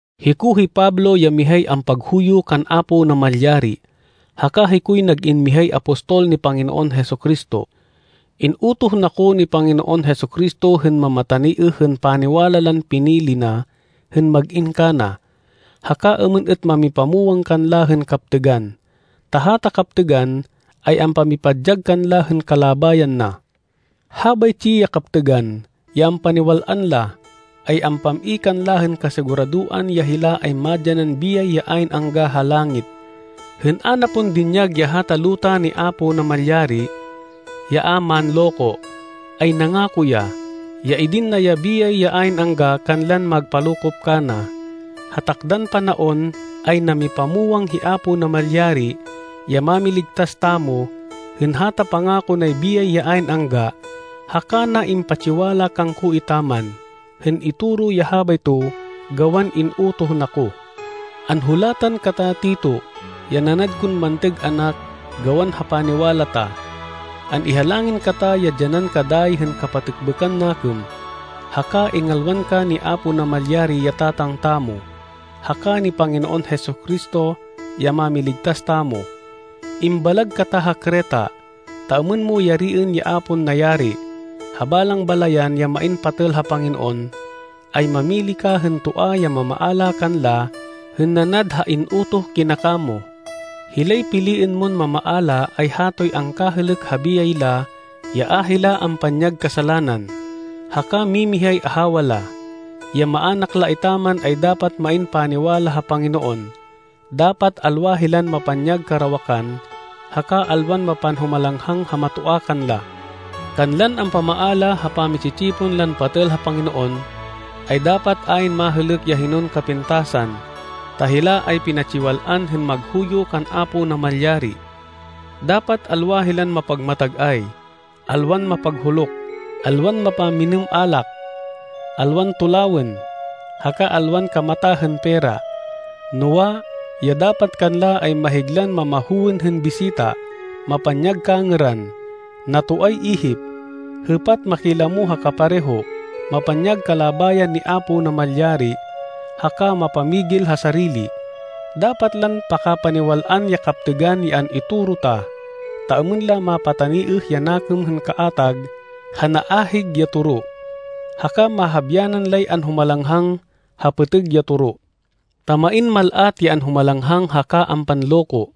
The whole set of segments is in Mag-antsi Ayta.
Hiko hi Pablo ya mihay ampaghuyo kan Apo Namalyari, haka hikoy nag-in mihay apostol ni Panginoon Jesu-Cristo. In-utoh na ko ni Panginoon Jesu-Cristo hên mamataniêh hên paniwala lan pinili na hên mag-in kana, haka êmên êt mamipamwang kanla hên kaptêgan. Ta hata kaptêgan ay ampamipadyag kanla hên kalabayan na. Habaytsi ya kaptêgan, ya ampaniwal-an la, ay ampam-i kanla hên kasiguradoan ya hila ay madyanan biyay ya ayn angga, ha langit. Hên a na pon dinyag ya hata luta ni Apo Namalyari, ya a manloko, ay nangako ya, ya idin na ya biyay ya ayn angga kanlan magpalokop kana. Ha takdan panaon, ay namipamwang hi Apo Namalyari, ya Mámiligtas tamo, hên hata pangako nay biyay ya ayn angga, haka na impatsiwala kangko etaman, hên itoro ya habayto gawan in-utoh na ko. Anhulatan kata, Tito, ya nanad kon mantêg anak gawan ha paniwala ta. An-ihalangin kata ya dyanan ka dayi hên kapatêkbêkan nakêm, haka ingalwan ka ni Apo Namalyari ya Tatang tamo, haka ni Panginoon Jesu-Cristo, ya Mámiligtas tamo. Imbalag kata ha Creta, ta êmên mo yariên ya a pon nayari. Ha balang balayan ya main patêl ha Panginoon, ay mamili ka hên toa ya mamaala kanla hên nanad ha in-utoh kina kamo. Hilay piliên mon mamaala ay hatoy angkahêlêk ha biyay la ya a hila ampanyag kasalanan, haka mimihay ahawa la. Ya maának la etaman ay dapat main paniwala ha Panginoon, dapat alwa hilan mapanyag karawakan, haka alwan mapanhumalanghang ha matoa kanla. Kanlan ampamaala ha pami-tsi-tsipon lan patêl ha Panginoon, ay dapat ayn mahêlêk ya hinon kapintasan, ta hila ay pinatsiwal-an hên maghuyo kan Apo Namalyari. Dapat alwa hilan mapagmatag-ay, alwan mapaghuluk, alwan mapamminêm alak, alwan tulawên, haka alwan kamata hên pera. Noa, ya dapat kanla ay mahiglan mamahowên hên bisita, mapanyag kangêran, natoay ihip, hêpat makilamo ha kapareho, mapanyag kalabayan ni Apo Namalyari, haka mapamigil ha sarili. Dapat lan pakapaniwal-an ya kaptêgan ya an-itoro ta, ta êmên la mapataniêh ya nakêm hên kaatag ha naahig ya toro, haka mahabyanan lay anhumalanghang ha pêtêg ya toro. Ta main mal-at ya anhumalanghang haka ampanloko,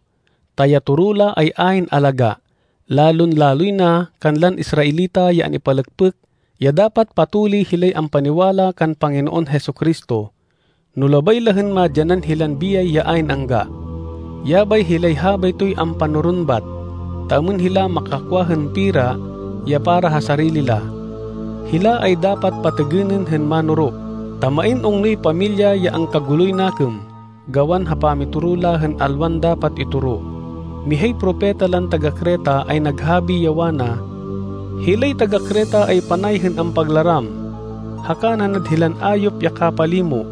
ta ya toro la ay ayn alagá, lalon-laloy na kanlan Israelita ya an-ipalêkpêk ya dapat patuli hilay ampaniwala kan Panginoon Jesu-Cristo, no labay la hên madyanan hilan biyay ya ayn angga. Yabay hilay habaytoy ampanoron bat, ta êmên hila makakwa hên pera ya para ha sarili la. Hila ay dapat patêgênên hên manoro, ta main ungnoy pamilya ya angkaguloy nakêm gawan ha pamitoro la hên alwan dapat itoro. Mihay propeta lan taga-Creta ay naghabi, ya wana, “Hilay taga-Creta ay panay hên ampaglaram, haka nanad hilan ayop ya kapalimo,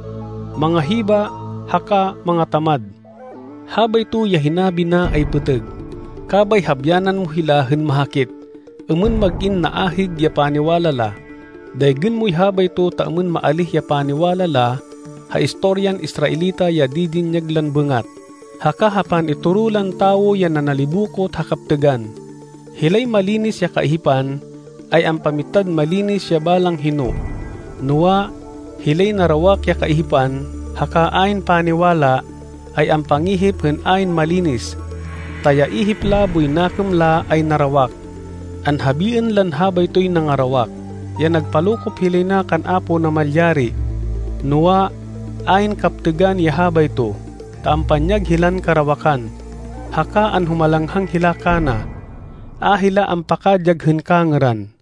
mangahiba haka mangatamad.” Habayto ya hinabi na ay pêtêg. Kabay habyanan mo hila hên mahakit, êmên mag-in naahig ya paniwala la. Daygên moy habayto ta êmên maalíh ya paniwala la ha istoryan Israelita ya didinyag lan bêngat, haka ha pan-itoro lan tawo ya nanalibokot ha kaptêgan. Hilay malinis ya kaihipan, ay ampamitad malinis ya balang hino, noa, hilay narawak ya kaihipan haka ayn paniwala, ay ampangihip hên ayn malinis, ta ya ihip la boy nakêm la ay narawak. Anhabiên lan habaytoy nangarawak, ya nagpalokop hilay na kan Apo Namalyari, noa, ayn kaptêgan ya habayto, ta ampanyag hilan karawakan, haka anhumalanghang hila kana. A hila ampakadyag hên kangêran.